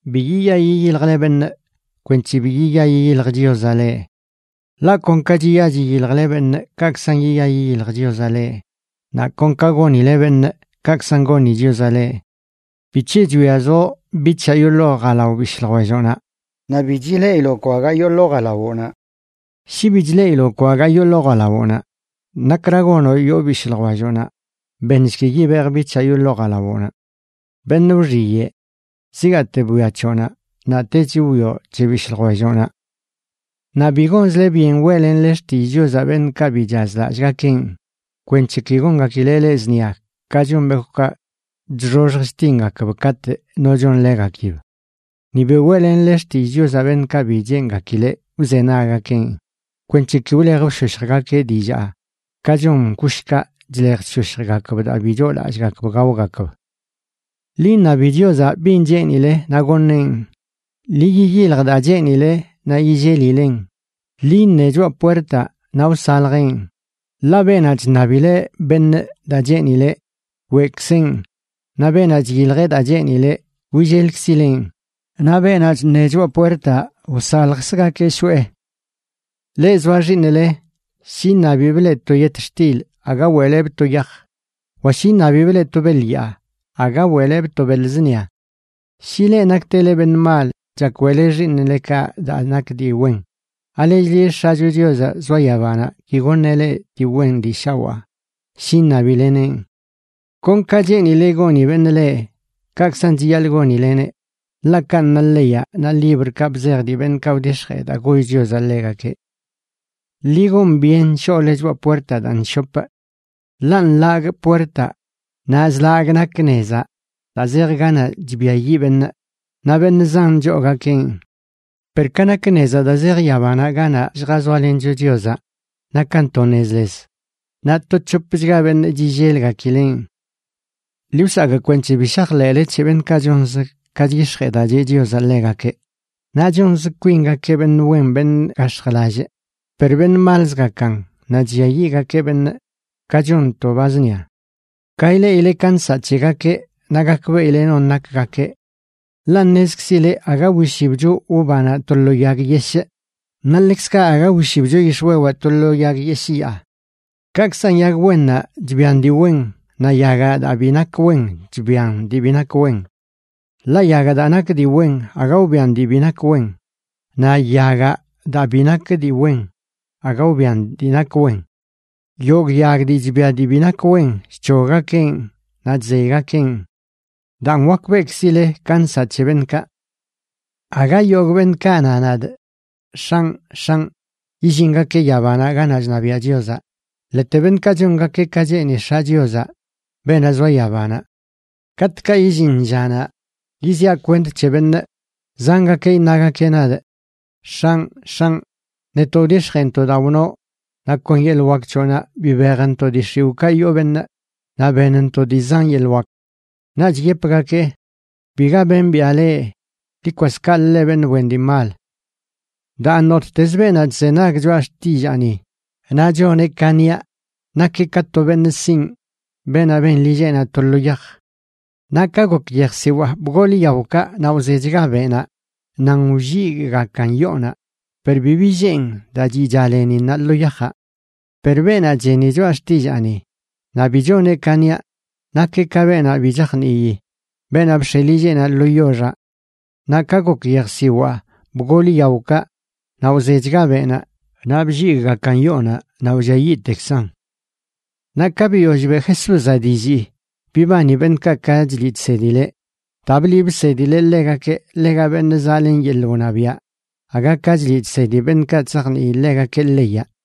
’Bi yiya yiyiljle beṉꞌ, kwenc̱he bi yiya yiyilj Chiozaꞌ leꞌ. Ḻaꞌ kon ka chiya chiyiljle beṉꞌ, kaꞌkzan yiya yiyilj Chiozaꞌ leꞌ, naꞌ kon ka gonile beṉꞌ, kaꞌkzan goni Chiozaꞌ leꞌ. ¿Bic̱he chwiazoꞌ bic̱haꞌ yoo ḻoo jalao bishꞌ ljwelloꞌnaꞌ naꞌ bi chileꞌiloꞌ kwagaa yoo ḻoo jalawoꞌnaꞌ? Shi bi chleꞌiloꞌ kwagaa yoo ḻoo jalawoꞌnaꞌ, ¿nakra gonoꞌ yoo bishꞌ ljwelloꞌnaꞌ: “Beṉshki yibejꞌ bic̱haꞌ yoo ḻoo jalawoꞌnaꞌ”? ¡Beṉꞌ wxiyeꞌ! Zigaate bwia c̱hoꞌnaꞌ naꞌtech wwioꞌ c̱he bishꞌ ljwelloꞌnaꞌ. ’Naꞌ bi gonzle byen weꞌlenle xtillꞌ Chiozaꞌ beṉꞌkaꞌ bi chazlallꞌgakeꞌn, kwenc̱he ki gongakileꞌ leꞌ zṉia ka chon bekwꞌkaꞌ chxoxj chtingakb katꞌ no chonḻegakib. Ni bi weꞌlenle xtillꞌ Chiozaꞌ beṉꞌkaꞌ bi cheengakileꞌ wzenaggakeꞌn kwenc̱he ki wlej wshoshjgakeꞌ dillaa ka chon kushkaꞌ chlej chshoshjgakb daa bi choolallꞌgakb gaogakb. ’Ḻi iṉabi Chiozaꞌ bin cheenile naꞌ goṉeꞌn. Ḻi yiyilj daa cheenile naꞌ yillelilen. Ḻi iṉe choꞌa puertaꞌ, naꞌ wsaljeꞌn. Ḻaꞌ beenaꞌ chṉabileꞌ beṉꞌ daa cheenileꞌ, weꞌkzeꞌn; naꞌ beenaꞌ chiyiljeꞌ daa cheenileꞌ, willelkzileꞌn; naꞌ beenaꞌ chṉe choꞌa puertaꞌ, wsaljkzgakeꞌ shoꞌe. ’Leꞌ zoa xiiṉle, shi iṉabibꞌ leꞌ to yetxtil aga weꞌlebꞌ to yaj. Wa shi iṉabibꞌ leꞌ to beḻ yaa, aga weꞌlebꞌ to beḻ zṉia. Shi leꞌ naktele beṉꞌ mal chak weꞌle xiiṉlekaꞌ daa nak dii wen, ¿alechli X̱acho Chiozaꞌ zoa yabanaꞌ ki goṉeꞌ leꞌ dii wen dii shawaa shi iṉabileneꞌn? ’Kon ka cheenile goni beṉꞌ leꞌ, kaꞌkzan chiyaḻꞌ gonileneꞌ, ḻaꞌ kanꞌ na leyaꞌ naꞌ librkaꞌ bzej dii beṉꞌkaꞌ wdix̱jee daa goll Chiozaꞌ ḻegakeꞌ. ’Ḻi gon byen shoꞌle choꞌa puertaꞌ daa nshopꞌ. Ḻaꞌ nḻagꞌ puertaꞌ naꞌ zlagꞌ nak nezaꞌ daa zej ganaꞌ chbiayiꞌ beṉꞌ, naꞌ beṉꞌ zan choogakeꞌn. Per ka nak nezaꞌ daa zej yabanaꞌ ganaꞌ lljazoalencho Chiozaꞌ, nakan to nez les, naꞌ to c̱hopchga beṉꞌ chillelgakileꞌn. ’Ḻi wsakꞌ kwenc̱he bi shajḻeꞌle c̱he beṉꞌkaꞌ chonz ka chyix̱jee daa cheꞌ Chiozaꞌ ḻegakeꞌ, naꞌ chonz kwingakeꞌ beṉꞌ wen beṉꞌ gax̱jlallꞌ, per beṉꞌ malzgakan naꞌ chlliayiꞌgakeꞌ beṉꞌ, ka chon to ba zṉia. Ka ileꞌile ka nsaꞌ c̱hegakeꞌ naꞌ gakbeꞌile non nakgakeꞌ. Ḻaꞌ ṉezkzile aga wishibcho uvanaꞌ to lo yag yeshꞌ naꞌ ḻekzkaꞌ aga wishibcho yix̱wewaꞌ to lo yag yeshꞌ yaa. Kaꞌkzan yag wennaꞌ chbian dii wen, naꞌ yagaꞌ daa bi nak wen chbian dii bi nak wen. Ḻaꞌ yagaꞌ daa nak dii wen aga wbian dii bi nak wen, naꞌ yagaꞌ daa bi nak dii wen aga wbian dii nak wen. Yogꞌ yag dii chbia dii bi nak wen, chc̱hoggakeꞌn naꞌ chzeygakeꞌn. Daan, wakbeꞌkzile ka nsaꞌ c̱he beṉꞌkaꞌ. ’Aga yogꞌ beṉꞌkaꞌ na nadꞌ: “X̱anꞌ, X̱anꞌ”, yillingakeꞌ yabanaꞌ ganaꞌ chṉabiaꞌ Chiozaꞌ, ḻete beṉꞌkaꞌ chongakeꞌ ka cheeni X̱aꞌ Chiozaꞌ, beenaꞌ zoa yabanaꞌ. Katꞌkaꞌ illin llanaꞌ yiziaꞌ kwent c̱he benꞌ, zangakeꞌ iṉagakeꞌ nadꞌ: “X̱anꞌ, X̱anꞌ, netoꞌ wdix̱jeentoꞌ daa wnoꞌ, naꞌ kon yeḻꞌ wak c̱hoꞌnaꞌ bibejntoꞌ dii x̱iwꞌkaꞌ yoo beṉꞌ naꞌ benntoꞌ dii zan yeḻꞌ wak.” Naꞌch yepgakee: “Biga bembiꞌa leꞌ. Ḻi kwas kaꞌlə, leꞌ beṉꞌ wen dii mal.” ’Daan, nottez beenaꞌ chzenag choꞌa xtillaani naꞌ choneꞌ ka niaꞌ, nakeꞌ ka to beṉꞌ sinꞌ, beenaꞌ ben lilleꞌnaꞌ to lo yaj. Naꞌ ka gok yejsiwaa, bgol yaokaꞌ, naꞌ wzechga beꞌnaꞌ nan wlligꞌgakan yoonaꞌ, per bi billeen daa chiꞌcha leninnaꞌ lo yajaꞌ. Per beenaꞌ cheni choꞌa xtillaani naꞌ bi choneꞌ ka niaꞌ, nakeꞌ ka beenaꞌ bi chajnii, beenaꞌ bx̱e lilleꞌnaꞌ lo yoxaꞌ. Naꞌ ka gok yejsiwaa, bgol yaokaꞌ, naꞌ wzechga beꞌnaꞌ naꞌ blligꞌgakan yoonaꞌ naꞌ wlliayiꞌtekzan. Naꞌ ka biyoll beꞌ Jesúzaꞌ dillii, bibani beṉꞌkaꞌ ka chliꞌ chsedileꞌ, daa bliꞌ bsedileꞌ ḻegakeꞌ ḻega beṉꞌ zaꞌlen yeḻꞌ wṉabiaꞌ, aga ka chliꞌ chsedi beṉꞌkaꞌ chzajnii ḻegakeꞌ leyaꞌ.